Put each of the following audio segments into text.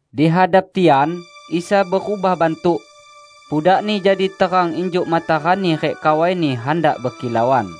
Di hadap tian, Isa berubah bantuk: Pudak-Ni jadi terang injuk matarani rik kawai-Ni handak bekilauan.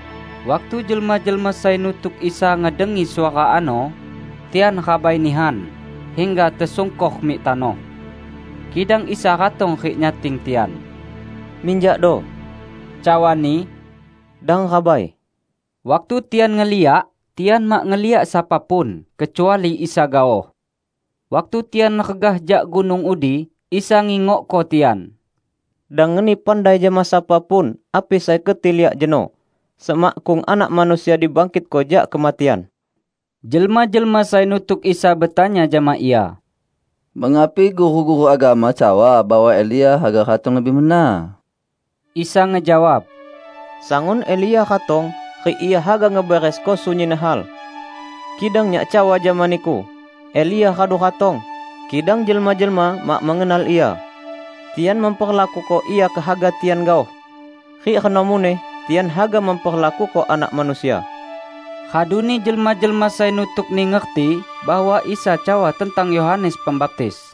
Waktu jelma-jelma sai nutuk Isa ngedengi suara ano, tian rabai nihan, hingga tesungkor mik tanoh. Kidang Isa ratong rik nyating tian. "Minjakdo," cawa-Ni, "dang rabai!" Waktu tian ngeliak, tian mak ngeliak sapa pun, kecuali Isa gaoh. Waktu tian regah jak gunung udi, Isa ngingokko tian, "Dang ngeni pandai jama sapa pun api sai keti liak jeno, semakkung Anak Manusia dibangkitko jak kematian." Jelma-jelma sai nutuk Isa betanya jama Ia, "Mengapi guru-guru agama cawa bahwa Elia haga ratong lebih mena?" Isa ngejawab, "Sangun Elia ratong rik ia haga ngeberesko sunyin hal. Kidang Nyak cawa jama niku, Elia radu ratong, kidang jelma-jelma mak mengenal ia; tian memperlakuko ia kehaga tian gaoh. Rik reno muneh tian haga memperlakuko Anak Manusia." Raduni jelma-jelma sai nutuk-Ni ngerti bahwa Isa cawa tentang Yohanes Pembaptis.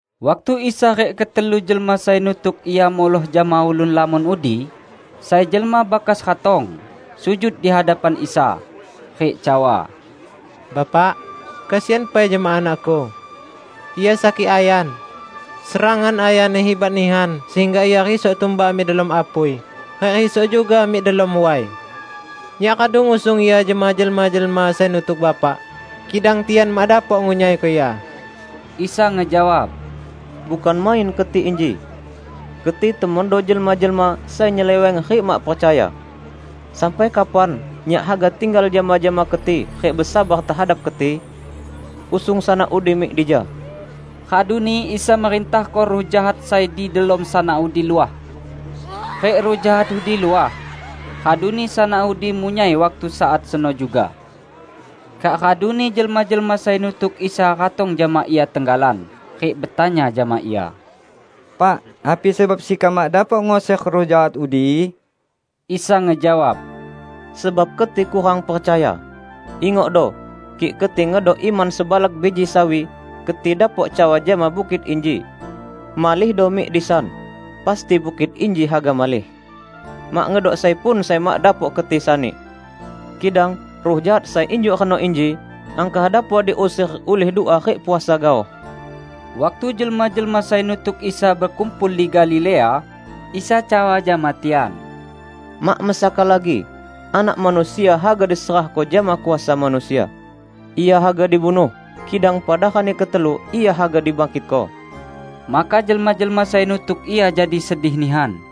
Waktu Isa rik ketelu jelma sai nutuk Ia muloh jama ulun lamon udi, sai jelma bakas ratong, sujud di hadapan Isa, rik cawa, "Bapak, kesian pai jama anakku. Ia sakik ayan. Serangan ayanni hibat nihan sehingga ia risok tumbak mik delom apui rik risok juga mik delom way. Nyak radu ngusung ia jama jelma-jelma sai nutuk Bapak, kidang tian mak dapok ngunyaiko ia." Isa ngejawab, "Bukan main keti inji! Keti temondo jelma-jelma sai nyeleweng rik mak percaya. Sampai kapan Nyak haga tinggal jama-jama keti rik besabar tehadap keti? Usung sanak udi mik dija!" Raduni Isa merintahko ruh jahat sai di delom sanak udi luah. Rik ruh jahat udi luah, raduni sanak udi munyai waktu saat seno juga. Kak raduni jelma-jelma sai nutuk Isa ratong jama Ia tenggalan rik betanya jama Ia, "Pak, api sebab sekam mak dapok nguser ruh jahat udi?" Isa ngejawab, "Sebab keti kurang percaya. Ingokdo! Kik keti ngedok iman sebalak biji sawi, keti dapok cawa jama bukit inji, 'Malihdo mik disan!' pasti bukit inji haga malih. Mak ngedok sai pun sai mak dapok keti sani! [ Kidang ruh jahat sai injuk reno inji, angkah dapok diuser ulih dua rik puasa gaoh.]" Waktu jelma-jelma sai nutuk Isa bekumpul di Galilea, Isa cawa jama tian, "Mak mesaka lagi, Anak Manusia haga diserahko jama kuasa manusia. Ia haga dibunuh, kidang pada rani ketelu Ia haga dibangkitko." Maka jelma-jelma sai nutuk Ia jadi sedih nihan.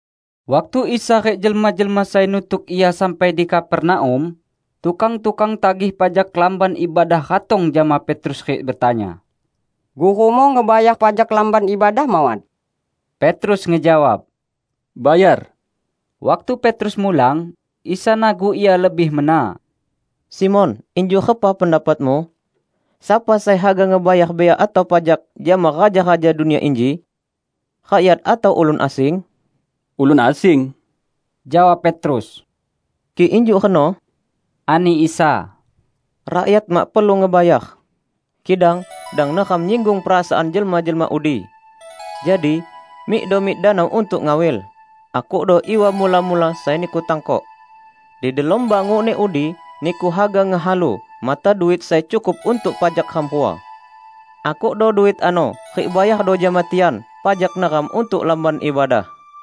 Waktu Isa rik jelma-jelma sai nutuk Ia sampai di Kapernaum, tukang-tukang tagih pajak Lamban Ibadah ratong jama Petrus rik betanya, "Gurumu ngebayar pajak Lamban Ibadah mawat?" Petrus ngejawab, "Bayar!" Waktu Petrus mulang, Isa nagu ia lebih mena, "Simon, injuk repa pendapatmu? Sapa sai haga ngebayar bea atau pajak jama raja-raja dunia inji? Rakyat atau ulun asing?" "Ulun asing," jawab Petrus. "Kik injuk reno," ani Isa, "rakyat mak perlu ngebayar. Kidang dang neram nyinggung perasaan jelma-jelma udi. Jadi, mikdo mik danau untuk ngawil. Akukdo iwa mula-mula sai niku tangkok. Di delom bangukni udi niku haga ngehalu mata duit sai cukup untuk pajak ram rua. Akukdo duit ano rik bayardo jama tian pajak neram untuk Lamban Ibadah."